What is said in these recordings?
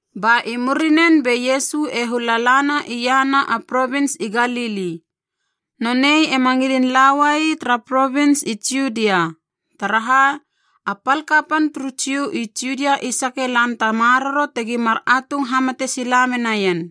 Ba i murinen be Iesu e hula lana iahana a provins i Galili. Nonei ema ngilin lauai tara provins i Judia, taraha a pal kapan turu Jiu i Judia i sake lan ta maroro tegi mar atung hamate sila menaien.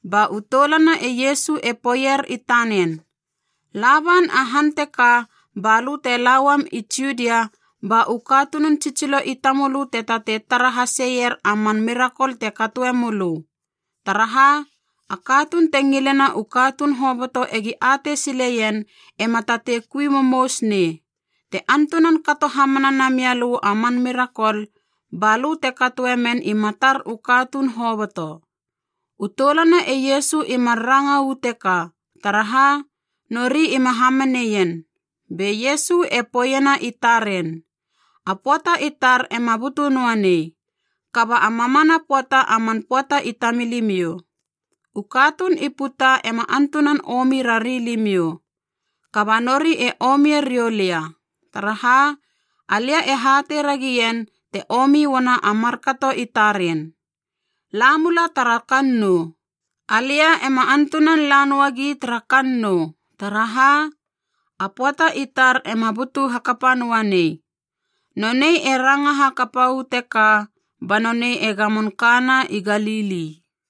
Ba u toulana e Iesu e poeier i tanen, “La ban a han teka balö te lauam i Judia ba u katunun tsitsilo i tamölö te tatei tara haseier a man mirakol te katoe mölö, taraha, a katuun te ngilena u katuun hoboto egi atei sileien ema tatei kui momous nei. Te antunan kato hamana namia lö a man mirakol, ba lö te katoe men i matar u katuun hoboto!” U toulana e Iesu i mar ranga uu teka, taraha nori ima hamaneien. Be Iesu e poeiena i taren, “A pöata i tar ema butu noa nei, kaba a mamana pöata a man pöata i tamilimiou. U katuun i puta ema antunan omi rari limiou, kaba nori e omie riou lia, taraha alia e hatei ragien te omi uana a markato i taren. La mula tara kannou. Alia ema antunan la noagi tara kannou, taraha a pöata i tar ema butu hakapa noa nei.” Nonei e ranga hakapa uu teka ba nonei e gamon kana i Galili.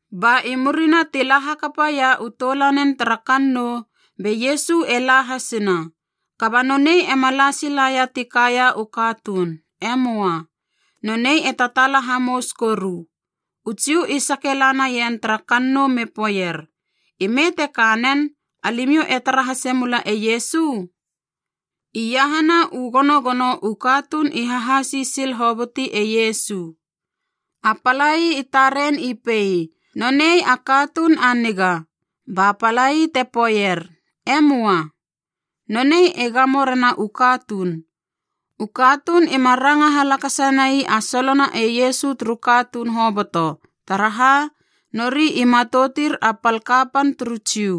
Ba i murina ti la hakapaia u toulanen tara kannou, be Iesu e la hasina. Kaba nonei ema la silaia ti kaia u katuun. E möa. Nonei e tataala hamous koru. U Jiu i sake la naien tara kannou me poeier, “Ime te ka nen, alimiou e tara hase mula e Iesu?” Iahana u gonogono u katuun i hahasi sil hoboti e Iesu. A palai i taren i pei, “Nonei a katuun a niga,” ba palai te poeier, “E möa. Nonei e gamo rena u katuun.” U katuun ima ranga halakasa nai a solona e Iesu turu katuun hoboto taraha, nori i matoutir a pal kapan turu Jiu.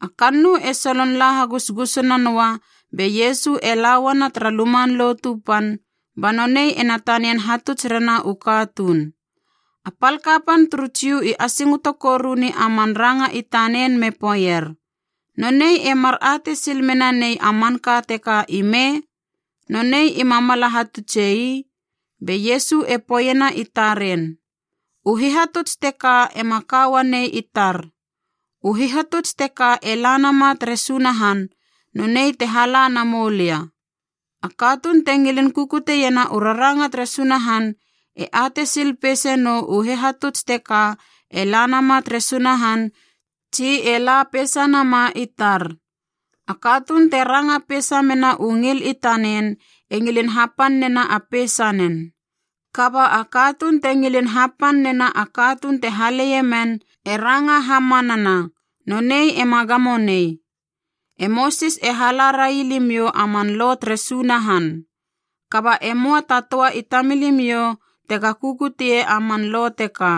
A kannou e solon la hagusgusuna noa be Iesu e la uana tara Luman Lotu Pan ba nonei ena tanian hatuts rena u katuun. A pal kapan turu Jiu i asingoto koruni a man ranga i tanen me poeier, “Nonei e mar atei sil menanei a manka teka ime? Nonei ima mala hatutse ii.” Be Iesu e poeiena i taren, “U hihatuts teka ema ka uanei i tar. U hihatuts teka e la nama tere Sunahan, nonei te hala na moulia. A katuun te ngilin kukuteiena u raranga tere Sunahan e atei sil peise nou u hihatuts teka e la nama tere Sunahan tsi e la peisa nama i tar. A katuun te ranga peisa mena u ngil i tanen e ngilin hapan nena a peisanen. Kaba a katuun te ngilin hapan nena a katuun te haleie men, e ranga hamanana, nonei ema gamo nei. E Mosis e hala rai limiou a man Lo tere Sunahan. Kaba e möa ta töa i tamilimiou tega kukutie a man Lo teka.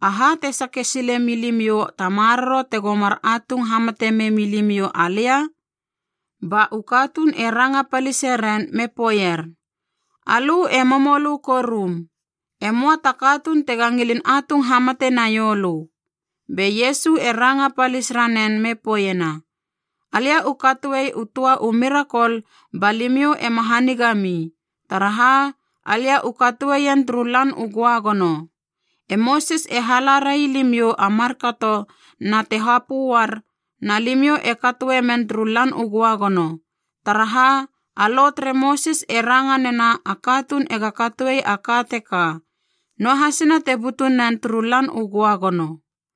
Aha te sake silemi limiou ta maroro tego mar atung hamate memi limiou alia?” Ba u katuun e ranga palise ren me poeier, “Alö e momolö korum! E möa ta katuun tega ngilin atung hamate naiou lö!” Be Iesu e ranga palis ranen me poeiena, “Alia u katoe u töa u mirakol ba limiou ema hanigami, taraha alia u katoeien turu Lan u Göagono. E Mosis e hala rai limiou a markato na te hapö uar naa limiou e katoemen turu lan u Göagono, taraha a Lo tere Mosis e ranga nena a katuun ega katoe a ka teka, noahasina te butunen turu Lan u Göagono.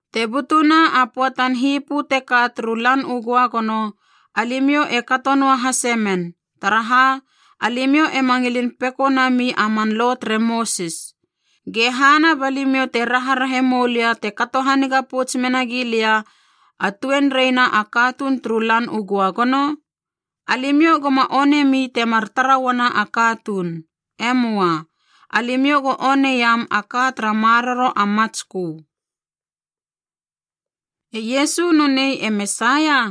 Te butuna a pöatan hipö teka turu Lan u Göagono, alimiou e kato noahase men, taraha alimiou ema ngilin peko nami a man Lo tere Mosis. Ge hana balimiou te raharahe moulia te kato haniga pouts menagi lia a tuenreina a katuun turu Lan u Göagono? Alimiou goma onemi temar tara uana a katuun. E möa. Alimiou go oneiam a ka tara maroro a matskö.” E Iesu nonei e Mesaia?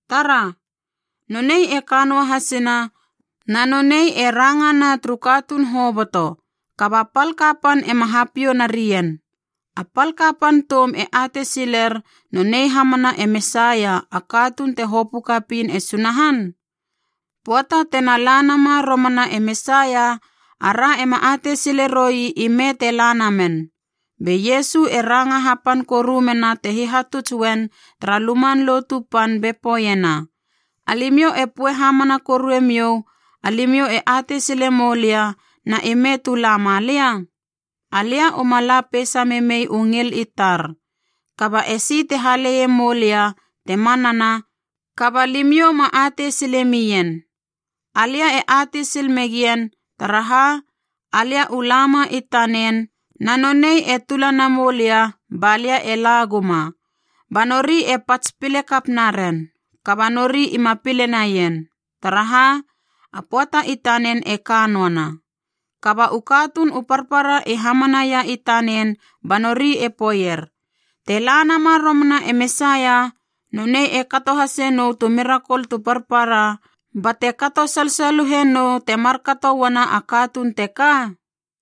Tara! Nonei e ka noa hasina na nonei e rangana turu katuun hoboto, kaba pal kapan ema hapiou narien! A pal kapan toum e atei siler nonei hamana e Mesaia, a katuun te hopö kapiin e Sunahan? Pöata tena la nama romana e Mesaia, ara ema atei sile roi ime te lana men.” Be Iesu e ranga hapan koru mena te hihatuts uen tara Luman Lotu Pan be poeiena, “Alimiou e poe hamana korue miou alimiou e atei sile moulia na ime tu la malia? Alia uma la peisa memei u ngil i tar, kaba esi te haleie moulia te manana, kaba limiou ma atei sile mien. Alia e atei sil megien. Taraha, alia u lama i tanen na nonei e tula namoulia ba lia e laguma.” Ba nori e pats pile kap naren, kaba nori ima pile naien, taraha a pöata i tanen e ka noana. Kaba u katuun u parpara i hamanaia i tanen ba nori e poeier, “Te la nama romana e Mesaia, nonei e kato hase nou tu mirakol tu parpara bate kato salsaluhenou te markato uana a katuun teka?”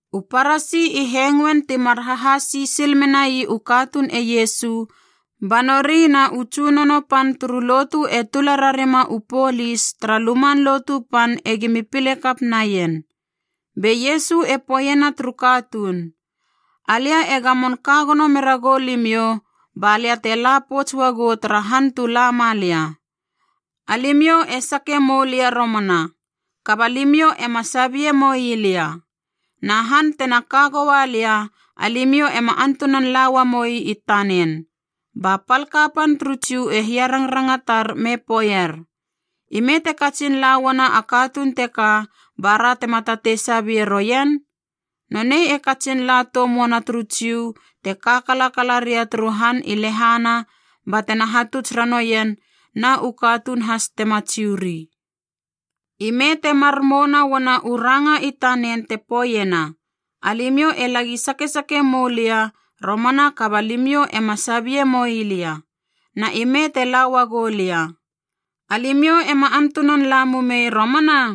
U Parasi i hengoen timar hahasi sil menai u katuun e Iesu, ba nori na u tsunono pan turu lotu e tula rarima u polis tara Luman Lotu Pan egimi pile kap naien. Be Iesu e poeiena turu katuun, “Alia e gamon ka gono mera gou limiou, balia te la pouts uagou tara han tu la ma lia. Alimiou e sake mou lia romana, kaba limiou ema sabie moi lia. Na han tena ka goua lia, alimiou ema antunan la uamoi i tanen.” Ba pal kapan turu Jiu e hiarangrangatar me poeier, “Ime te katsin la uana a katuun teka bara tema tatei sabie roien? Nonei e katsin la toum uana turu Jiu te ka kalakala ria turu han i lehana batena hatuts ranoien na u katuun has tema Jiu ri. I me temar mouna uana u ranga i tanen te poeiena, ‘Alimiou e lagi sakesake mou lia romana kaba limiou ema sabie moi lia,’ na ‘ime te la uagu lia, alimiou ema antunan la mumei romana’?”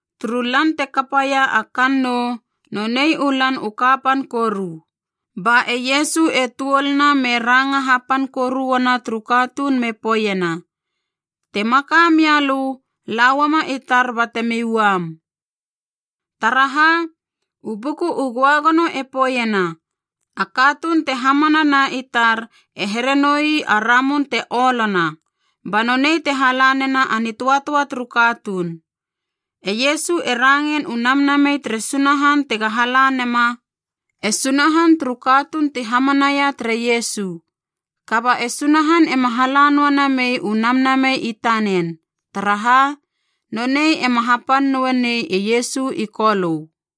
Turu lan te kapaia a kannou, nonei u lan u kapan koru. Ba e Iesu e tuoluna me ranga hapan koru uana turu katuun me poeiena, “Te maka mia lö, la uama i tar batemi uam. Taraha, u Buku u Göagono e poeiena a katuun te hamanana i tar e here noi a ramun te olona, ba nonei te hala nena a nitöatöa turu katuun.” E Iesu e rangein u Namnamei tere Sunahan tega hala nema e Sunahan turu katuun ti hamanaia tere Iesu. Kaba e Sunahan ema hala noa namei u Namnamei i tanen, taraha nonei ema hapan noe nei e Iesu i Kolö.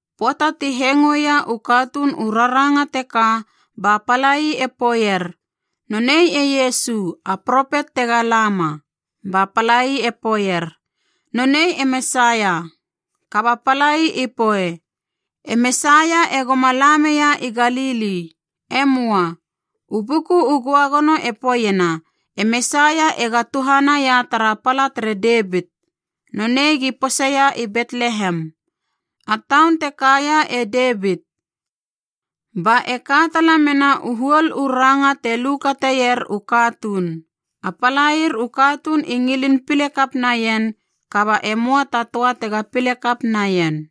Pöata ti hengoeia u katuun u raranga teka ba palai e poeier, “Nonei e Iesu, a propet tega lama.” Ba palai e poeier, “Nonei e Mesaia.” Kaba palai i poe, “E Mesaia egoma la meia i Galili. E möa. U Buku u Göagono e poeiena e Mesaia ega tuhanaia tara pala tere Devit. Nonei gi poseia i Betlehem, a taun te kaia e Devit.” Ba e ka tala mena u huol u ranga te lu kateir u katuun. A palair u katuun i ngilin pile kap naien, kaba e möa ta töa tega pile kap naien.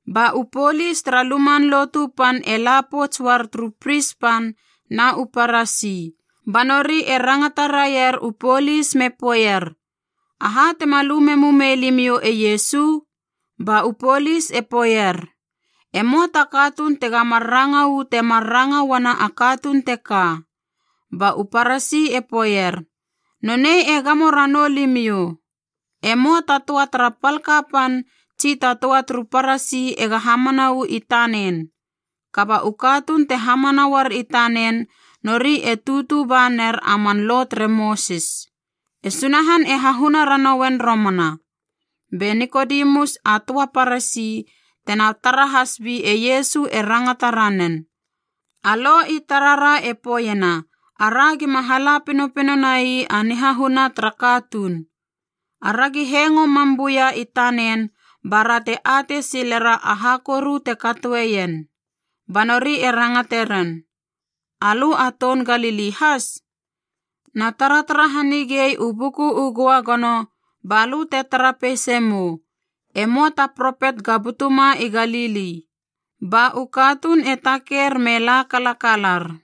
Ba u polis tara Luman Lotu Pan e la pouts uar turu pris pan na u Parasi, ba nori e rangata raier u polis me poeier, “Aha tema lu memu mei limiou e Iesu?” Ba u polis e poeier, “E möa ta katuun tega mar ranga uu temar ranga uana a katuun teka.” Ba u Parasi e poeier, “Nonei e gamo ranamou limiou? E möa ta töa tara pal kapan tsi ta töa turu Parasi ega hamana uu i tanen. Kaba u katuun te hamana uar i tanen, nori e tutu ba ner a man Lo tere Mosis. E Sunahan e hahuna ranouen romana.” Be Nikodemus a töa Parasi, tena tara has bi e Iesu e rangata ranen, “A Lo i tarara e poeiena ara gima hala pinopino nai a nihahuna tara katuun. Aragi hengo mam buia i tanen bara te atei silera aha koru te katoeien.” Ba nori e rangate ren, “Alö a toun Galili has? Na taratara hanigei u Buku u Göagono balö te tara peisa mou, e möa ta propet ga butuma i Galili.” Ba u katuun e taker me la kalakalar.